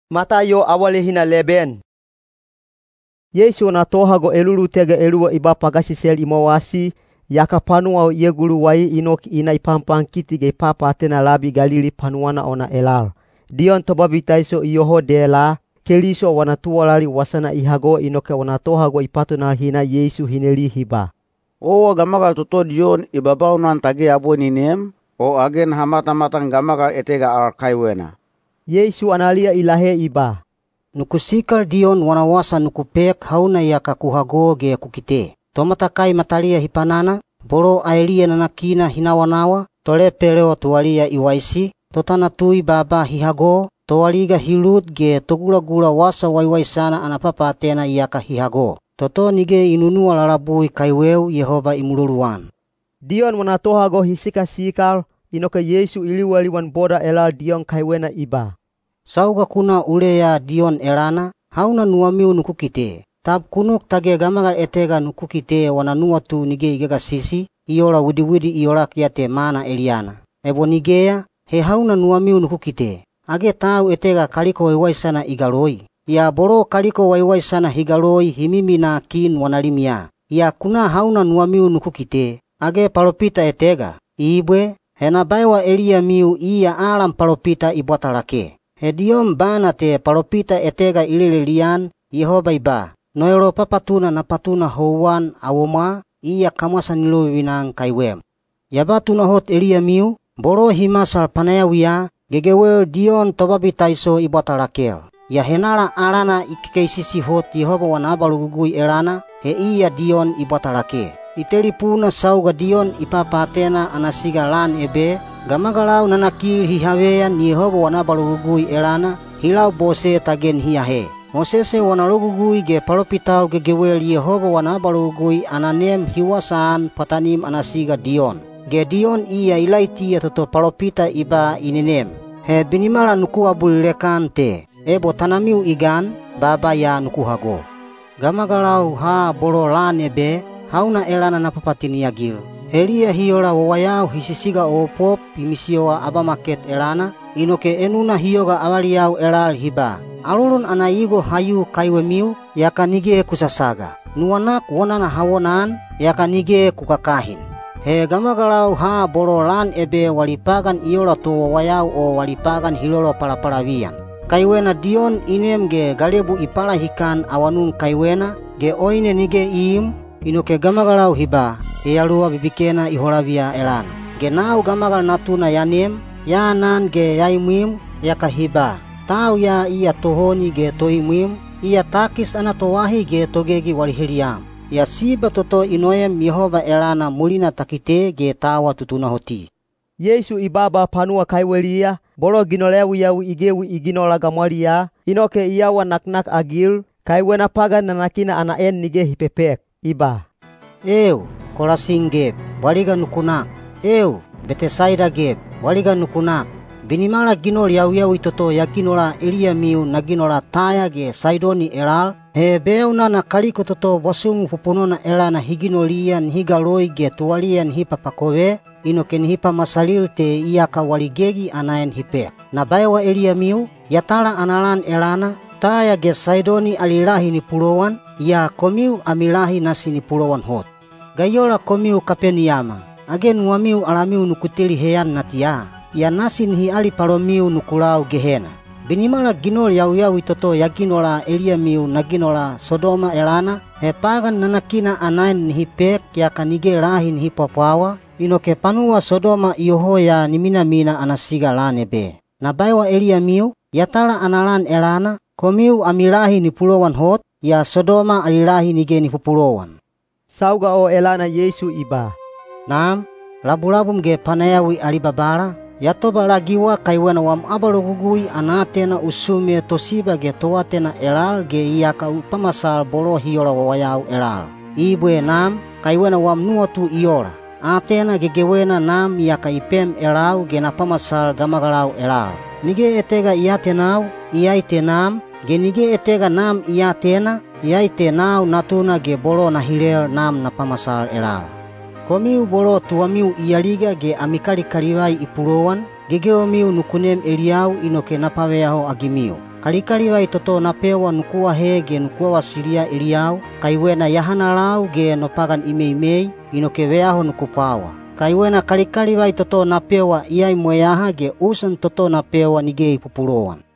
Sauga Yeisu wana tohago elulutega eluwa i ba pagasisel i mowasi, yaka panuwa o i eguluwai i nok i na i panpankiti ge i papaatena labi Galili panuwana ona elal. Diyon Tobabitaiso iyoho dela, Keliso wana tuwalali wasana i hago inoke wana tohago i patunal hi na Yeisu hi neli hi ba, “Owa gamagal toto Diyon i babaunan tage abwe ni nem, o age naha matamatan gamagal etega al kaiwena?” Yeisu analiya i lahe i ba, “Nuku sikal Diyon wana wasa nuku pek hauna iyaka ku hago ge ku kite: tomatakai mataliya hi panana, bolo aeliya nanakina hi nawanawa, tolepelo tuwaliya i waisi, totanatui baaba hi hago, toaliga hi lut ge togulagula Wasa Waiwaisana ana papaatena iyaka hi hago. Toto nige i nunuwa lalabui kaiweu Yehoba i muloluan.” Diyon wana tohago hi sikasikal, inoke Yeisu i liwaliwan boda elal Diyon kaiwena i ba, “Sauga ku na uleya Diyon elana, hauna nuwamiu nuku kite? Tab ku nok tage gamagal etega nuku kite wana nuwatu nige i gagasisi, i ola widiwidi i olak ya te mana eliyana? Ebo nigeya, he hauna nuwamiu nuku kite? Age tau etega kaliko waiwaisana i galoi? Yaa bolo kaliko waiwaisana hi galoi hi miminaa kin wali limiya. Yaa ku na hauna nuwamiu nuku kite? Age palopita etega? Ibwe! He na baewa eliyamiu iya alan palopita i bwata lake. He Diyon bana te palopita etega i lelelian, Yehoba i ba: No elopapatuna na patuna houwan awomwa, iya kamwasa ni lovivina-an kaiwem. Ya ba tunahot eliyamiu, bolo hi masal panayawiya, gegewel Diyon Tobabitaiso i bwata lakel. Yaa henala alana i kekeisisi hot Yehoba wana abalogugui elana, he iya Diyon i bwata lake. I telipuna sauga Diyon i papaatena ana siga lan ebe, gamagalau nanakil hi haveyan Yehoba wana abalogugui elana, hi labose tage nihi ahe. Mosese wana Logugui ge palopitau gegewel Yehoba wana abalogugui ana nem hi wasaan pwatanim ana siga Diyon. Ge Diyon iya Ilaitiya toto palopita i ba i nenem. He binimala nuku abulilek-an te. Ebo tanamiu i gan, baaba ya nuku hago. Gamagalau ha bolo lan ebe, hauna elana na papatini-agil? Heliya hi ola wawayau hi sisigaopop hi misiyowa abamaket elana, inoke enuna hi yoga avaliyau elal hi ba: Alolon ana igo ha yu kaiwemiu, yaka nige ku sasaga. Nuwanak wonana ha wonaan, yaka nige ku kakahin. He gamagalau ha bolo lan ebe wali pagan i ola to wawayau o wali pagan hi lolopalapalaviyan. Kaiwena Diyon i nem ge galebu i palahikan awanun kaiwena, ge oine nige i iim, inoke gamagalau hi ba, ‘Yayaluwa bibikena i holaviya elana.’ Ge nau Gamagal Natuna ya nem, ya anan ge ya imwim, yaka hi ba, ‘Tau ya iya tohoni ge toimwim, iya takis ana toahi ge togegi wali heliyam.’ Yaa siba toto i noem Yehoba elana mulina ta kite ge ta awa tutunahoti.” Yeisu i baaba panuwa kaiweliya, bolo ginol yawiyawi i gewi i ginola gamwaliyaa, inoke i awa naknakagil, kaiwena pagan nanakina ana en nige hi pepek. I ba, “Eeu! Kolasin geb, bwaliga nuku nak! Eeu! Betesaida geb, bwaliga nuku nak! Binimala ginol yawiyawi toto ya ginola eliyamiu na ginola Taya ge Saidoni elal, he beyaunana kaliko toto bwasumu pupunona elana hi ginoliya nihi galoi ge tuwaliya nihi papakove, inoke nihi pamasalil te iyaka wali gegi ana en hi pek. Na baewa eliyamiu, yatala ana lan elana, Taya ge Saidoni ali lahi ni pulowan, yaa komiu ami lahi nasi ni pulowan hot. “Ga i ola komiu Kapeniyama! Age nuwamiu alamiu nuku teli heyan natiya? Yaa nasi nihi alipalomiu nuku lau Gehena. Binimala ginol yawiyawi toto ya ginola eliyamiu na ginola Sodoma elana, he pagan nanakina ana en nihi pek yaka nige lahi nihi pwapwawa, inoke panuwa Sodoma iyoho ya ni minamina ana siga lan ebe. Na baewa eliyamiu, yatala ana lan elana, komiu ami lahi ni pulowan hot, yaa Sodoma ali lahi nige ni pupulowan.” Sauga o elana Yeisu i ba, “Nam, labulabum ge panayawi ali Babala, ya tobalagiwa kaiwena wam abalogugui ana aatena u sume tosiba ge toatena elal ge iyaka u pamasal bolo hi ola wawayau elal. Ibwe Nam, kaiwena wam nuwatu i ola. “Aatena gegewena Nam iyaka i pem elau ge na pamasal gamagalau elal. Nige etega i aatenau, iyai te Nam, ge nige etega Nam i aatena, iyai te nau Natuna ge bolo na hilel Nam na pamasal elal. “Komiu bolo tuwamiu i aliga ge ami kalikalivai i pulowan, gegewemiu nuku nem eliyau inoke na paveyaho-agimiu. Kalikalivai toto na pewa nuku ahe ge nuku vavasiliya eliyau, kaiwena ya hanalau ge no pagan i meimei, inoke veyaho nuku pwawa. Kaiwena kalikalivai toto na pewa i aimweyaha ge usan toto na pewa nige i pupulowan.”